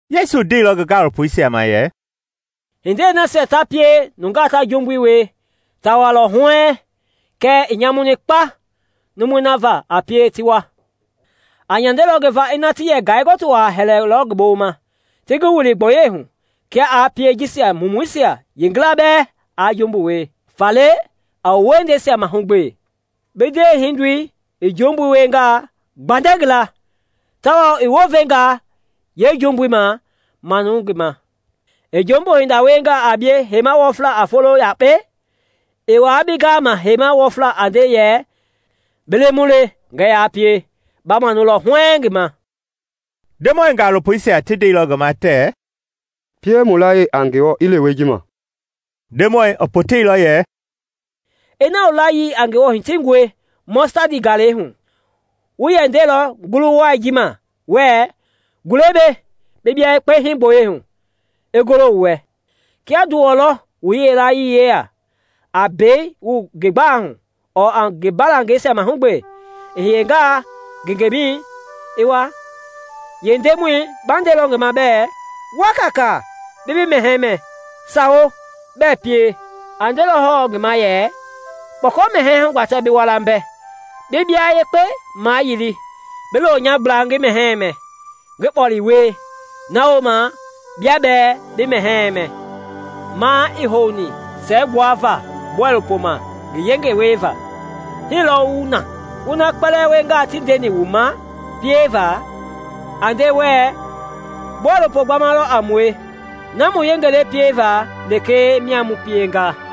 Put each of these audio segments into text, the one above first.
Yesu ndeilɔ ngi gaalopoisia ma yɛ, “Hindei nasia ta pie nungaa ta jumbui wie, ta walɔ huɛɛŋ, kɛɛ i nyamuni kpa numui na va a pie ti wa! Aa nyandelɔ ngi va ina ti yɛ ngai-gɔtu wa hɛlɛilɔ ngi boloma ti ngi wili gboyei hu kia aa pie jisia mumuisia yeengila bɛɛ aa jumbu wie. Faale a wu wiehindei mahugbe! “Bi ndewehindoi i jumbu wiengaa, gbandɛ ngi la, tawao i wounvengaa yeejumbui ma, manu ngi ma. I jumbu hinda wiengaa a bie heima wɔfla a folo yakpei, i wa bi gama heima wɔfla a nde yɛ, ‘Bi lemu le, ngɛɛ ya pie,’ ba manulɔ huɛɛŋ ngi ma.” Ndemɔi gaalopoisia ti ndeilɔ ngi ma tɛɛ, “pie mu layii a Ngewɔ i lewe ji ma.” Ndemɔi i poteilɔ yɛ, “Ina wu layii a Ngewɔ hitingɔe mɔstadi galɛi hu, wu yɛ ndelɔ ngulu wai ji ma wɛɛ, ‘Gule mbei bi bia yekpe hii gboyei hu!’ i golo wu wɛ. “Kia nduwɔ lɔ wu yilayee yeya, a mbei wu ngi gbalei hu ɔɔ a ngi mbalangɛisia mahugbe, i hiyenga ngengemɛi i wa, yeendemɔi ba ndelɔ ngi ma bɛ ‘Wa kaakaa bi bi mɛhɛɛ mɛ?’ Sawo, bɛɛ pie! A ndelɔ hɔɔ ngi ma yɛ, ‘Kpɔkɔ-mɛhɛɛ hugbatɛ bi wa la mbɛ, bi bia yekpe mayili, bi lo nya gbla ngi mɛhɛɛ mɛ, ngi kpɔle wie; na wooma bia bɛɛ bi mɛhɛɛ mɛ.’ Ma ii houni siɛgbuava bɔilopoi ma ngi yengei wieva. Hii lɔɔ wu na, wu na kpɛlɛɛ wiengaa ti ndeni wu ma pieva, a nde wɛɛ, ‘Bɔilopo gbama lɔ a mue; na mu yenge le pieva lekee mia mu pienga.’”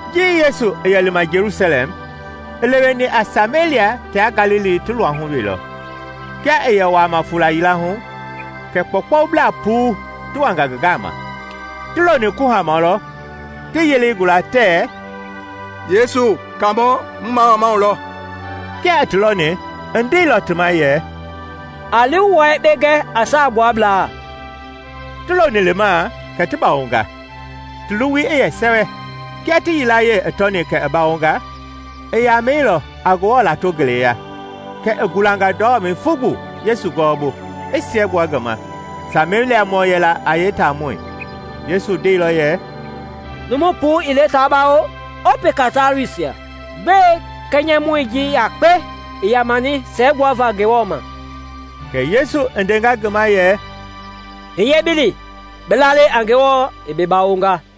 Ji yesu i yɛ lima Jelusalɛm, i leweni a Samelia tia Galili ti luahui wee lɔ. Kia i yɛ wuama fuula yila hu kɛ kpɔukpɔublaa puu ti wanga ngi gama. Ti loni kuhama lɔ ti yelei gula tɛɛ, “Yesu, Kaamɔ, mu mamamau lɔ.” Kia i ti lɔni i ndeilɔ ti ma yɛ, “A li wu wua yekpe gɛ a saagbuablaa.” Ti loni lima kɛ ti bawonga, ti luwui i yɛ sɛwɛ. Kia ti yilayee i tɔni kɛ i bawonga, i yamɛilɔ, a Ngewɔ lato ngeleya; kɛ i gulanga ndɔmɛi fugbu Yesu gɔwɔbu, i siɛgbua ngi ma. Sameliamɔ yɛla a yeetaamɔi. Yesu ndeilɔ yɛ, “Numu puu ii le ta bawo? Ɔɔ peka taluisia? Gbɛe kɛnyɛmɔi ji yakpe i yamani siɛgbuava Ngewɔ ma?” Kɛ Yesu i ndenga ngi ma yɛ, “Hiye bi li; bi lalei a Ngewɔ i bi bawonga.”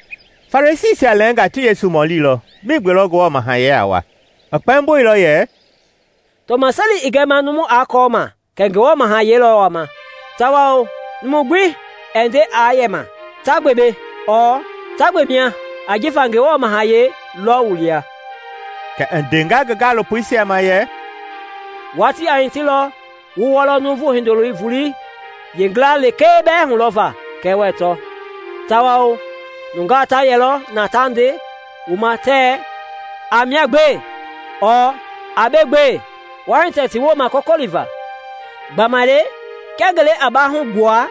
Farisiisia lɛɛnga ti Yesu mɔlilɔ migbe lɔ Ngewɔ Mahayɛi a wa. I kpɛmboilɔ yɛ, “Tɔmaseli ii gɛma numu aa kɔɔ ma kɛ Ngewɔ Mahayɛi lɔ wama; tawao numu gbi ɛɛ nde aa yɛma ‘Ta gbe mbei’ ɔɔ ‘Ta gbe mia!’ ajifa Ngewɔ Mahayɛi lɔ wu lia.” Kɛ i ndenga ngi gaalopoisia ma yɛ, “Watii a hitilɔ wu wɔlɔ Nuuvu Hindoloi voleisia yeengila lekee bɛɛ hulɔvaa, kɛɛ wɛɛ tɔ. Tawao nungaa ta yɛlɔ na ta nde wu ma tɛɛ, ‘A mia gbe!’ ɔɔ ‘A mbei gbee!’ Waa hitɛ ti wooma kɔkɔliva. Gbamaile kia ngelei a bahu gbua,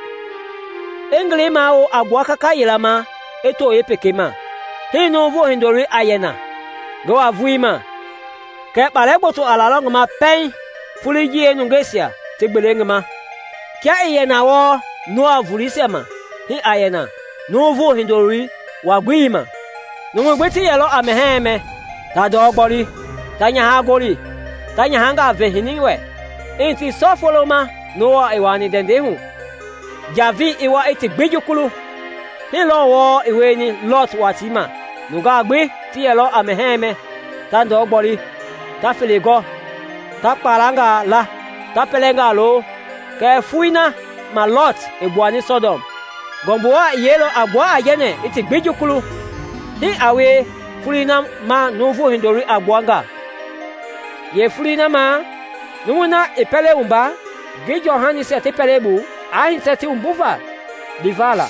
i ngelei mawo a gbua kaka yila ma i to yeepekei ma, hii Nuuvu Hindoloi a yɛ na ngi wa-volei ma. Kɛɛ kpalɛ gboto a lalɔ ngi ma pɛiŋ foloi ji yeenungeisia ti gbele ngi ma. Kia i yɛ na wɔɔ Noa voleisia ma, hii a yɛ na Nuuvu Hindoloi wa-gbelei ma. Numui gbi ti yɛlɔ a mɛhɛɛ mɛ, ta ndɔ gboli, ta nyaha gɔli, ta nyahangaa ve hini wɛ, i hiti sɔ foloi ma Noa i wuani ndɛndɛi hu, njavei i wa i ti gbi jukulu. Hii lɔɔ wɔɔ i wieni Lɔt watii ma nungaa gbi ti yɛlɔ a mɛhɛɛ mɛ, ta ndɔ gboli, ta fele gɔ, ta kpalangaa la, ta pɛlɛngaa lo, kɛɛ foloi na ma Lɔt i gbuani Sɔdɔm, ngɔmbu wa i yeilɔ a gbua aijɛnɛ i ti gbi jukulu. Hii a wie foloi na ma Nuuvu Hindoloi a gbua nga. “Yeefoloi na ma, numui na i pɛlei wumba, ngi jɔhanisia ti pɛlei bu, aa hitɛ ti wumbuva liva la;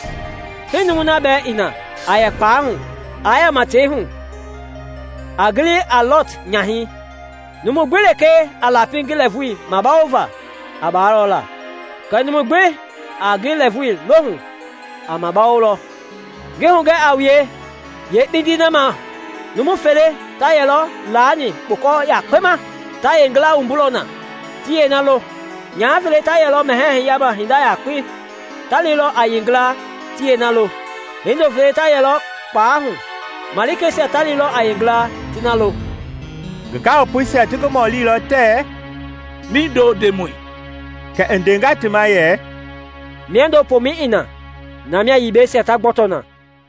hii numui na bɛɛ i na a yɛ kpalɛi hu, aa yama tei hu. A gili a Lɔt nyahɛi. Numu gbi lekee a lapi ngi lɛɛvui mabawova, a baalɔ la, kɛɛ numu gbi a ngi lɛɛvui lohu, a mabawolɔ. Ngi hugɛ a wue, yeekpindii na ma, numu fele ta yɛlɔ laani kpukɔ yakpei ma; ta yeegila wumbulɔ na, ti yeena lo. Nyaha fele ta yɛlɔ mɛhɛɛ hiyama hinda yakpei; ta lilɔ a yeengila, ti yeena lo. [ Hindo fele ta yɛlɔ kpalɛi hu; malikeisia ta lilɔ a yeengila, ti na lo.]” Ngi gaalopoisia ti ngi mɔlilɔ tɛɛ, “Mindo, Ndemɔi?” Kɛ i ndenga ti ma yɛ, “Miando pomɛi i na, na mia yibɛisia ta gbɔtɔ na.”